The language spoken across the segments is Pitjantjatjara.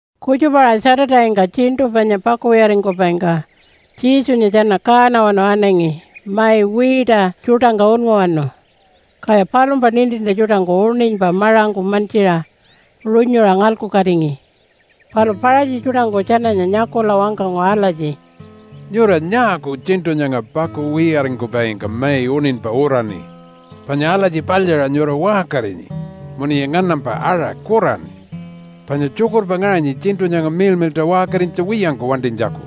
Kutjupa-aṟa Saturday-ngka tjiṉṯu panya pakuwiyaringkupaingka Jesunya tjana kaanawanu anangi mai wiita tjuṯangka unnguwanu. Kaya palumpa nintintja tjuṯangku uṉinypa maṟangku mantjiṟa runyuṟa ngalkukatingi. Palu Paṟatji tjuṯangku tjananya nyakula wangkangu alatji, “Nyura nyaaku tjiṉṯu nyanga pakuwiyaringkupaingka mai uṉinypa uraṉi? Panya alatji palyaṟa nyura waṟkarinyi munuya nganampa aṟa kuraṉi, panya tjukurpa ngaṟanyi tjiṉṯu nyanga miḻmiḻṯa waṟkarinytja wiyangku wantinytjaku.”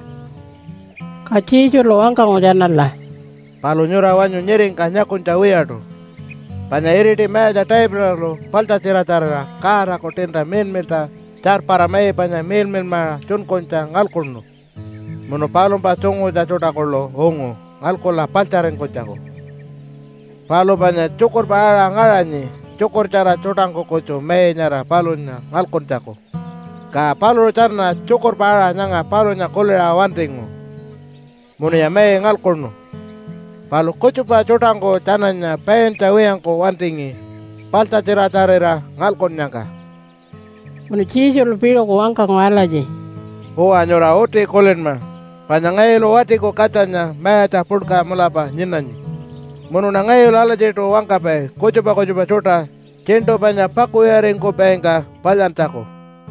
Ka Jesulu wangkangu tjanala, “Palu nyura wanyu nyiringka nyakunytja wiyaṯu panya iriti mayatja Davidalu paḻtjatjiratjarira Godaku tiinta miḻmiḻṯa tjarpara mai panya miḻmiḻmaṟa tjunkunytja ngalkuṉu munu palumpa tjungutja tjuṯa kuḻu ungu ngalkula paḻtjaringkunytjaku. Palu panya tjukurpa aṟa ngaṟanyi tjukurtjara tjuṯangku kutju mai nyara palunya ngalkuntjaku. Ka paluṟu tjana tjukurpa aṟa nyanga palunya kuliṟa wantingu munuya mai ngalkuṉu, palu kutjupa tjuṯangku tjananya paintja wiyangku wantingi paḻtjatjiratjarira ngalkunnyangka.” Munu Jesulu piṟuku wangkangu alatji, “Uwa, nyura uti kulinma panya ngayulu Watiku Katjanya mayatja puḻka mulapa nyinanyi, munuṉa ngayulu alatjiṯu wangkapai kutjupa kutjupa tjuṯa tjiṉṯu panya pakuwiyaringkupaingka palyantjaku.”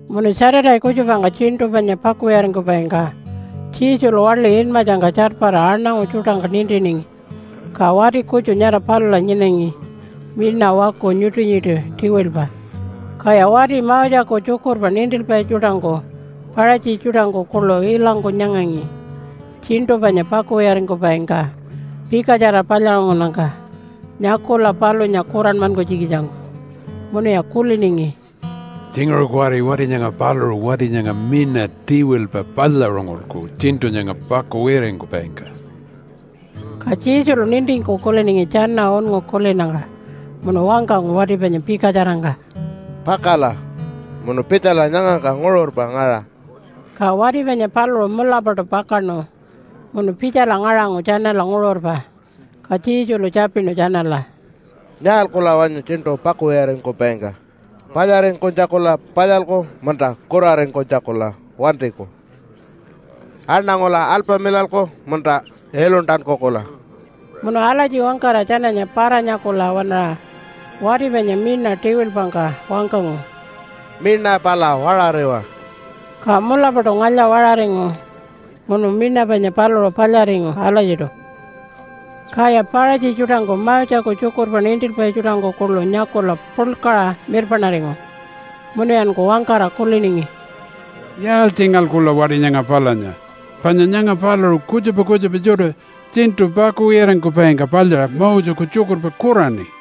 Munu Saturday kutjupangka tjiṉṯu panya pakuwiyaringkupaingka Jesulu waḻi inmatjangka tjarpara aṉangu tjuṯangka nintiningi. Ka wati kutju nyara palula nyinangi miṉa waku nyuṯi-nyuṯi tiwilpa. Kaya wati Moseku tjukurpa nintilpai tjuṯangku Paṟatji tjuṯangku kuḻu ilangku nyangangi tjiṉṯu panya pakuwiyaringkupaingka pikatjara palyaṟungunnyangka nyakula palunya kuranmankunytjikitjangku. Munuya kuliningi, “Tjinguṟu kuwari wati nyanga paluṟu wati nyanga miṉa tiwilpa palyaṟungulku tjiṉṯu nyanga pakuwiyaringkupaingka.” Ka Jesulu nintingku kuliningi tjana unngu kulinnyangka munu wangkangu wati panya pikatjarangka, “Pakala munu pitjala nyangangka nguṟurpa ngaṟa.” Ka wati panya paluṟu mulapaṯu pakaṉu munu pitjala ngaṟangu tjanala nguṟurpa. Ka Jesulu tjapinu tjanala, “Nyaalkula wanyu tjiṉṯu pakuwiyaringkupaingka? Palyaringkunytjakula palyalku munta kuraringkunytjakula wantiku? Aṉangula alpamilalku munta iluntankukula?” Munu alatji wangkara tjananya para-nyakula waṉaṟa wati panya miṉa tiwilpangka wangkangu, “Miṉa pala waṟariwa!” Ka mulapaṯu ngalya-waṟaringu munu miṉa panya paluṟu palyaringu alatjiṯu. Kaya Paṟatji tjuṯangku Moseku tjukurpa nintilpai tjuṯangku kuḻu nyakula puḻkaṟa mirpaṉaringu munuyanku wangkara kuliningi, “Yaaltjingalkula wati nyanga palunya? Panya nyanga paluṟu kutjupa kutjupa tjuṯa tjiṉṯu pakuwiyaringkupaingka palyaṟa Moseku tjukurpa kuraṉi.”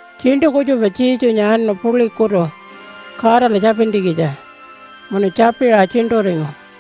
Tjiṉṯu kutjupa Jesunya anu puḻikutu Godala tjapintjikitja munu tjapiṟa tjiṉṯuringu.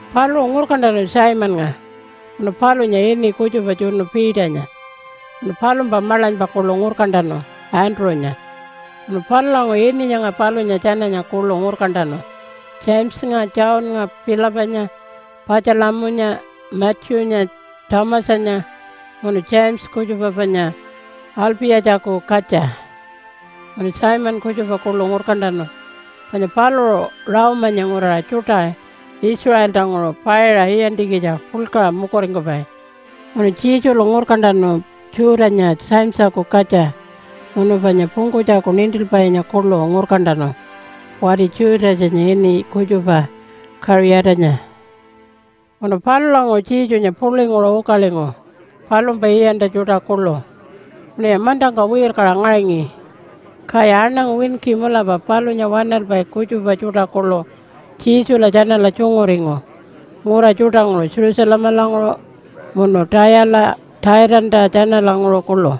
Paluṟu ngurkantanu Simonnga, munu palunya ini kutjupa tjunu Peternya, munu palumpa maḻanypa kuḻu ngurkantanu Andrew-nya. Munu palulanguṟu ini nyanga palunya tjananya kuḻu ngurkantanu Jamesanya, Johnnga, Philipanya, Patjalamunya, Matthew-nya, Thomasanya, munu James kutjupa panya Alpi-yatjaku katja, munu Simon kutjupa kuḻu ngurkantanu, panya paluṟu Rome-anya nguraṟa tjuṯa Israeltanguṟu paiṟa iyantjikitja puḻkaṟa mukuringkupai. Munu Jesulu ngurkantanu Jude-anya Jamesaku katja, munu panya pungkunytjaku nintilpainya kuḻu ngurkantanu wati Judasanya ini kutjupa Kaṟiyatanya. Munu palulanguṟu Jesunya puḻinguṟu ukalingu palumpa iyantja tjuṯa kuḻu munuya mantangka wirkaṟa ngaṟangi. Kaya aṉangu winki mulapa palunya waṉalpai kutjupa tjuṯa kuḻu Jesula tjanala tjunguringu ngura tjuṯanguṟu Jerusalemalanguṟu munu Tayala Tjaitanta tjanalanguṟu kuḻu.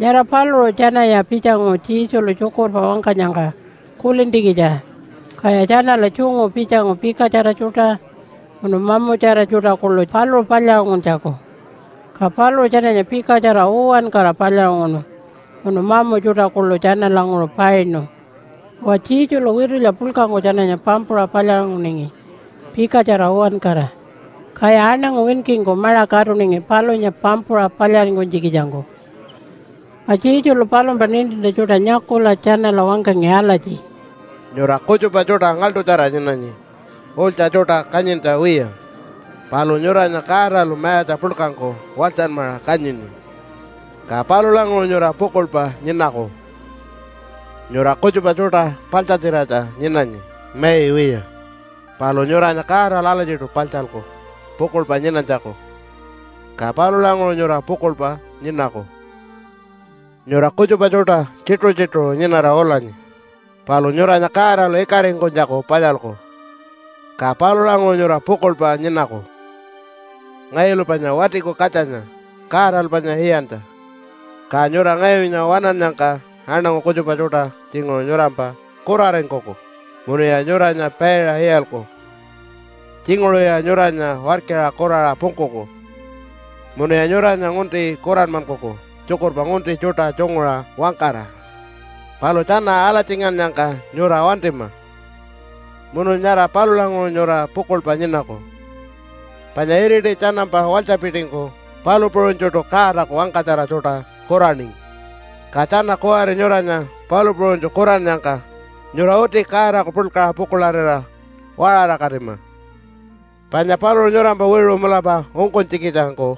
Nyara paluṟu tjanaya pitjangu Jesulu tjukurpa wangkanyangka kulintjikitja kaya tjanala tjungu pitjangu pikatjara tjuṯa munu mamutjara tjuṯa kuḻu paluṟu palyaṟunguntjaku. Ka paluṟu tjananya pikatjara uwankara palyaṟunguṉu munu mamu tjuṯa kuḻu tjanalanguṟu painu. Uwa, Jesulu witulya puḻkangku tjananya pampuṟa palyaṟunguningi pikatjara uwankara. Kaya aṉangu winkingku maṟa katuningi palunya pampuṟa palyaringkunytjikitjangku. Ka Jesulu palumpa nintintja tjuṯa nyakula tjanala wangkangi alatji, “Nyura kutjupa tjuṯa ngaḻṯutjara nyinanyi ulytja tjuṯa kanyintja wiya. Palu nyuranya Godalu mayatja puḻkangku walytjanmaṟa kanyini, ka palulanguṟu nyura pukuḻpa nyinaku. Nyura kutjupa tjuṯa paḻtjatjiratja nyinanyi mai wiya. Palu nyuranya Godalu alatjiṯu paḻtjalku pukuḻpa nyinanytjaku, ka palulanguṟu nyura pukuḻpa nyinaku. Nyura kutjupa tjuṯa tjituṟu-tjituṟu nyinara ulanyi. Palu nyuranya Godalu ikaringkunytjaku palyalku, ka palulanguṟu nyura pukuḻpa nyinaku. “Ngayulu panya Watiku Katjanya Godalu panya iyantja, ka nyura ngayunya waṉannyangka aṉangu kutjupa tjuṯa tjinguṟu nyurampa kuraringkuku munuya nyuranya paiṟa iyalku. Tjinguṟuya nyuranya warkira kuraṟa pungkuku munuya nyuranya ngunti kuranmankuku tjukurpa ngunti tjuṯa tjunguṟa wangkara. Palu tjana alatjingannyangka nyura wantima munu nyara palulanguṟu nyura pukuḻpa nyinaku. Panya iriti tjanampa walytjapitingku palu puṟunytjuṯu Godaku wangkatjara tjuṯa kuraningi. Ka tjana kuwari nyuranya palu puṟunytju kurannyangka nyura uti Godaku puḻkaṟa pukuḻarira waṟarakatima, panya paluṟu nyurampa wiṟu mulapa ungkunytjikitjangku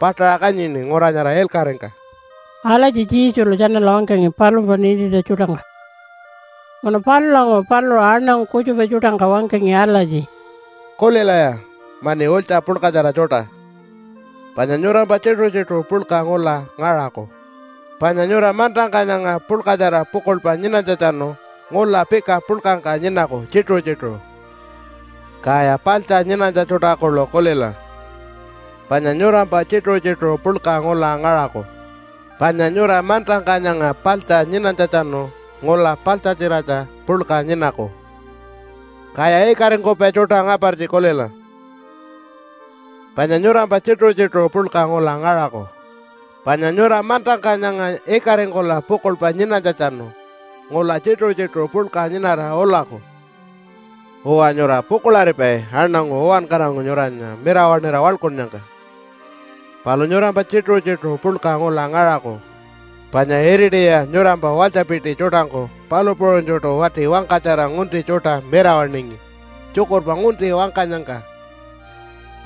paṯaṟa kanyini ngura nyara ilkaṟingka.” Alatji Jesulu tjanala wangkangi palumpa nintintja tjuṯangka. Munu palulanguṟu paluṟu aṉangu kutjupa tjuṯangka wangkangi alatji, “Kulilaya mani ulytja puḻkatjara tjuṯa! Panya nyurampa tjituṟu-tjituṟu puḻka ngula ngaṟaku. Panya nyura mantangka nyanga puḻkatjara pukuḻpa nyinanytjatjanu ngula pika puḻkangka nyinaku tjituṟu-tjituṟu. Kaya paḻtja nyinanytja tjuṯa kuḻu kulila! Panya nyurampa tjituṟu-tjituṟu puḻka ngula ngaṟaku. Panya nyura mantangka nyanga paḻtja nyinanytjatjanu ngula paḻtjatjiratja puḻka nyinaku. Kaya ikaringkupai tjuṯa ngapartji kulila! Panya nyurampa tjituṟu-tjituṟu puḻka ngula ngaṟaku. Panya nyura mantangka nyanga ikaringkula pukuḻpa nyinanytjatjanu ngula tjituṟu-tjituṟu puḻka nyinara ulaku. “Uwa, nyura pukuḻaripai aṉangu uwankarangku nyuranya mirawaṉira waḻkunnyangka. Palu nyurampa tjituṟu-tjituṟu puḻka ngula ngaṟaku. Panya iritiya nyurampa walytjapiti tjuṯangku palu puṟunytjuṯu wati wangkatjara ngunti tjuṯa mirawaṉingi tjukurpa ngunti wangkanyangka.”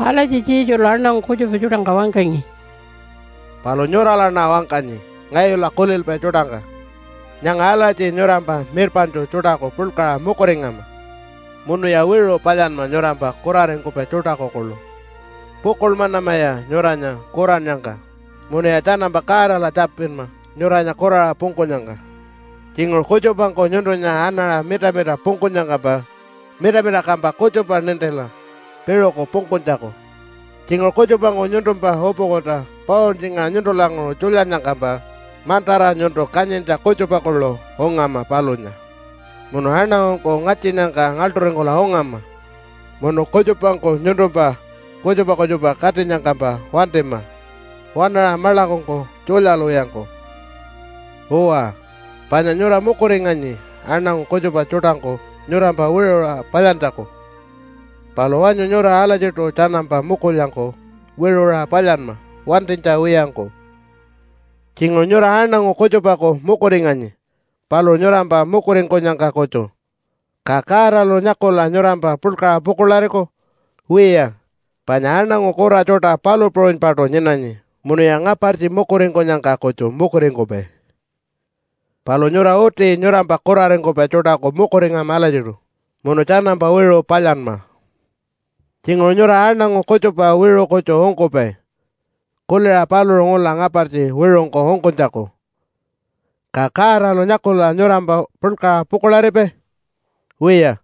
Alatji Jesulu aṉangu kutjupa tjuṯangka wangkangi. “Palu nyuralaṉa wangkanyi ngayula kulilpai tjuṯangka nyanga alatji nyurampa mirpaṉtju tjuṯaku puḻkaṟa mukuringama munuya wiṟu palyanma nyurampa kuraringkupai tjuṯaku kuḻu. Pukuḻmanamaya nyuranya kurannyangka munuya tjanampa Godala tjapinma nyuranya kuraṟa pungkunyangka. Tjinguṟu kutjupangku nyuntunya anaṟa mita-mita pungkunyangkampa mita-mita kampa kutjupa nintila piṟuku pungkunytjaku. Tjinguṟu kutjupangku nyuntumpa upukuta pauntjingaṟa nyuntulanguṟu tjulyannyangkampa mantara nyuntu kanyintja kutjupa kuḻu ungama palunya. Munu aṉangungku ngatjinnyangka ngaḻṯuringkula ungama munu kutjupangku nyuntumpa kutjupa kutjupa katinyangkampa wantima waṉaṟa maḻakungku tjulyalwiyangku. “Uwa, panya nyura mukuringanyi aṉangu kutjupa tjuṯangku nyurampa wiṟuṟa palyantjaku. Palu wanyu nyura alatjiṯu tjanampa mukulyangku wiṟuṟa palyanma wantinytja wiyangku. “Tjinguṟu nyura aṉangu kutjupaku mukuringanyi paluṟu nyurampa mukuringkunyangka kutju. Ka Godalu nyakula nyurampa puḻkaṟa pukuḻariku? Wiya, panya aṉangu kura tjuṯa palu puṟunypaṯu nyinanyi munuya ngapartji mukuringkunyangka kutju mukuringkupai. Palu nyura uti nyurampa kuraringkupai tjuṯaku mukuringama alatjiṯu munu tjanampa wiṟu palyanma. “Tjinguṟu nyura aṉangu kutjupa wiṟu kutju ungkupai kuliṟa paluṟu ngula ngapartji wiṟungku ungkunytjaku. Ka Godalu nyakula nyurampa puḻkaṟa pukuḻaripai? Wiya,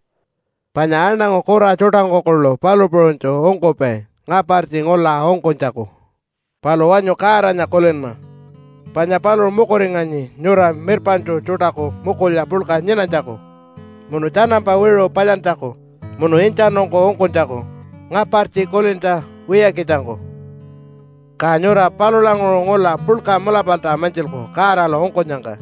panya aṉangu kura tjuṯangku kuḻu palu puṟunytju ungkupai ngapartji ngula ungkunytjaku. Palu wanyu Godanya kulinma panya paluṟu mukuringanyi nyura mirpaṉtju tjuṯaku mukulya puḻka nyinanytjaku munu tjanampa wiṟu palyantjaku, munu intjanungku ungkunytjaku ngapartji kulintja wiyakitjangku. Ka nyura palulanguṟu ngula puḻka mulapalta mantjilku Godalu ungkunyangka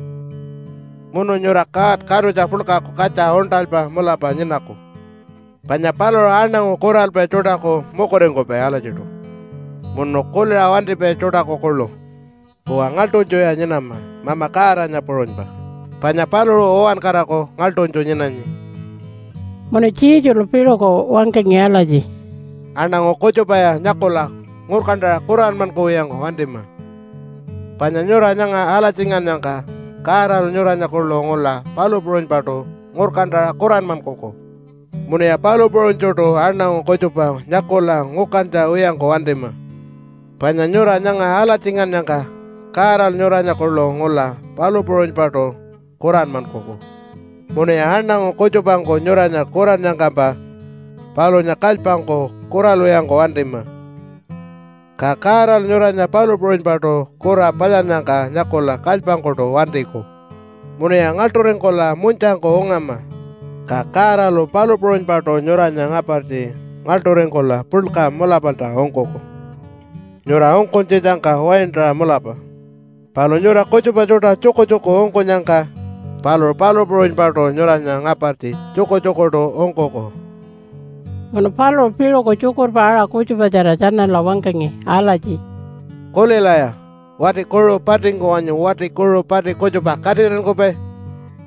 munu nyura God Katutja Puḻkaku katja uṉṯalpa mulapa nyinaku, panya paluṟu aṉangu kuralpai tjuṯaku mukuringkupai alatjiṯu munu kuliṟa wantipai tjuṯaku kuḻu. Uwa, ngaḻṯunytjuya nyinama Mama Godanya puṟunypa panya paluṟu uwankaraku ngaḻṯunytju nyinanyi.” Munu Jesulu piṟuku wangkangi alatji, “Aṉangu kutjupaya nyakula ngurkantaṟa kuranmankuwiyangku wantima. Panya nyura nyanga alatjingannyangka Godalu nyuranya kuḻu ngula palu puṟunypaṯu ngurkantaṟa kuranmankuku. Munuya palu puṟunytjuṯu aṉangu kutjupa nyakula ngukantja wiyangku wantima. Panya nyura nyanga alatjingannyangka Godalu nyuranya kuḻu ngula palu puṟunypaṯu kuranmankuku. Munuya aṉangu kutjupangku nyuranya kurannyangkampa palunya kalypangku kuralwiyangku wantima, ka Godalu nyuranya palu puṟunypaṯu kura palyannyangka nyakula kalypangkuṯu wantiku. Munuya ngaḻṯuringkula munytjangku ungama, ka Godalu palu puṟunypaṯu nyuranya ngapartji ngaḻṯuringkula puḻka mulapalta ungkuku nyura ungkunytjitjangka waintaṟa mulapa. Palu nyura kutjupa tjuṯa tjukutjuku ungkunyangka paluṟu palu puṟunypaṯu nyuranya ngapartji tjukutjukuṯu ungkuku.” Munu paluṟu piṟuku tjukurpa aṟa kutjupatjara tjanala wangkangi alatji, “Kulilaya! Wati kuṟu patingku wanyu wati kuṟu pati kutjupa katiṟinkupai?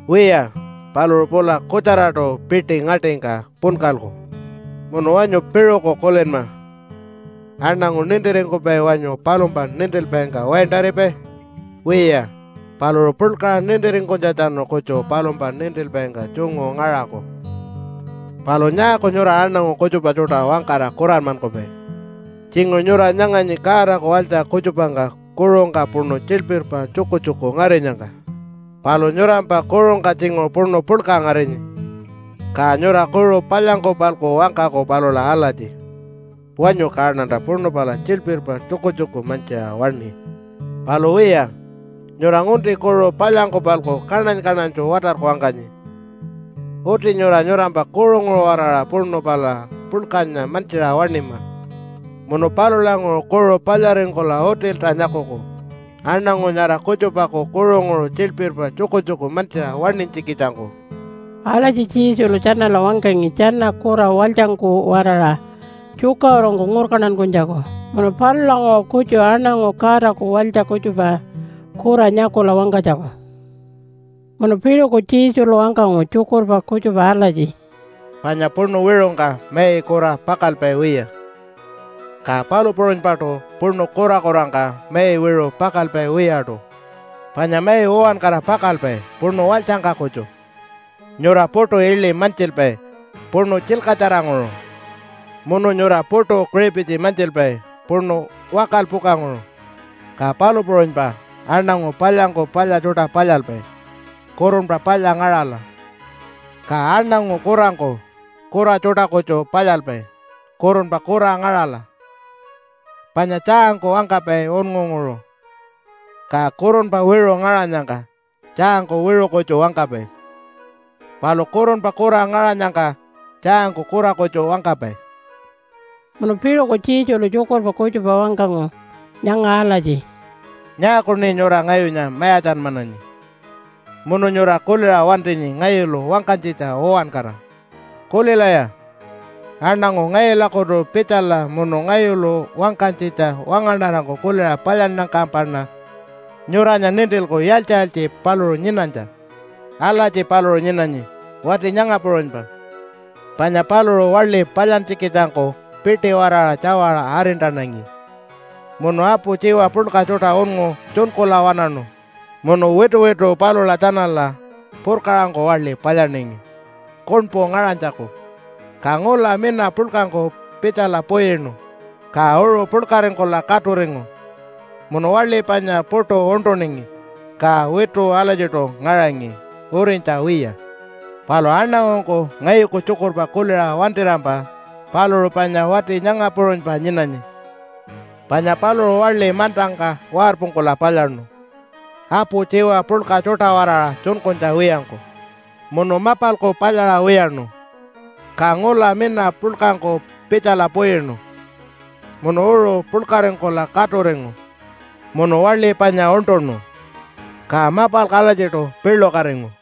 Wiya. Paluṟu pula kutjaraṯu piṯi ngaṯingka punkalku. Munu wanyu piṟuku kulinma. Aṉangu nintiringkupai wanyu palumpa nintilpaingka waintaripai? Wiya. Paluṟu puḻkaṟa nintiringkunytjatjanu kutju palumpa nintilpaingka tjungu ngaṟaku. “Palu nyaaku nyura aṉangu kutjupa tjuṯa wangkara kuranmankupai? Tjinguṟu nyura nyanganyi Godaku walytja kutjupangka kuṟungka puṉu tjilpirpa tjukutjuku ngarinyangka. Palu nyurampa kuṟungka tjinguṟu puṉu puḻka ngarinyi. Ka nyura kuṟu palyangku-palku wangkaku palula alatji, ‘Wanyu kaṉanta puṉu pala tjilpirpa tjukutjuku mantjiṟa waṉi.’ Palu wiya, nyura ngunti kuṟu palyangku-palku kaṉany-kaṉanytju watarku wangkanyi. Uti nyura nyurampa kuṟunguṟu-waraṟa puṉu pala puḻkanya mantjiṟa waṉima, munu palulanguṟu kuṟu palyaringkula utilta nyakuku, aṉangu nyara kutjupaku kuṟunguṟu tjilpirpa tjukutjuku mantjiṟa waṉinytjikitjangku.” Alatji Jesulu tjanala wangkangi tjana kura walytjangku-waraṟa tjukaṟurungku ngurkantankunytjaku munu palulanguṟu kutju aṉangu Godaku walytja kutjupa kura nyakula wangkanytjaku. Munu piṟuku Jesulu wangkangu tjukurpa kutjupa alatji, “Panya puṉu wiṟungka mai kura pakalpai wiya. Ka palu puṟunypaṯu puṉu kurakurangka mai wiṟu pakalpai wiyaṯu. Panya mai uwankara pakalpai puṉu walytjangka kutju. Nyura puṯu iḻi mantjilpai puṉu tjilkatjaranguṟu munu nyura puṯu kiṟipitji mantjilpai puṉu wakalpukanguṟu. Ka palu puṟunypa aṉangu palyangku palya tjuṯa palyalpai, kurunpa palya ngaṟala. Ka aṉangu kurangku kura tjuṯa kutju palyalpai, kurunpa kura ngaṟala. Panya tjaangku wangkapai unngunguṟu. Ka kurunpa wiṟu ngaṟanyangka, tjaangku wiṟu kutju wangkapai, palu kurunpa kura ngaṟanyangka, tjaangku kura kutju wangkapai.” Munu piṟuku Jesulu tjukurpa kutjupa wangkangu nyanga alatji, “Nyaakuṉi nyura ngayunya mayatjanmananyi munu nyura kuliṟa wantinyi ngayulu wangkanytjitja uwankara? Kulilaya, aṉangu ngayulakutu pitjala munu ngayulu wangkanytjitja wangaṉarangku kuliṟa palyannyangkampaṉa nyuranya nintilku yaaltji-yaaltji paluṟu nyinanytja. Alatji paluṟu nyinanyi wati nyanga puṟunypa, panya paluṟu waḻi palyantjikitjangku piṯi-waraṟa tjawaṟa arintanangi, munu apu tjiwa puḻka tjuṯa unngu tjunkula waṉaṉu, munu wituwitu palula tjanala purkaṟangku waḻi palyaningi, kuṉpu ngaṟanytjaku. Ka ngula mina puḻkangku pitjala puyinu. Ka uṟu puḻkaringkula katuringu, munu waḻi panya puṯu uṉṯuningi. Ka witu alatjiṯu ngaṟangi urinytja wiya. Palu aṉangungku ngayuku tjukurpa kuliṟa wantirampa paluṟu panya wati nyanga puṟunypa nyinanyi. Panya paluṟu waḻi mantangka warpungkula palyaṉu, apu tjiwa puḻka tjuṯa-waraṟa tjunkunytja wiyangku munu mapalku palyaṟa wiyaṉu. Ka ngula mina puḻkangku pitjala puyinu munu uṟu puḻkaringkula katuringu munu waḻi panya uṉṯuṉu. Ka mapalku alatjiṯu piḻukatingu.”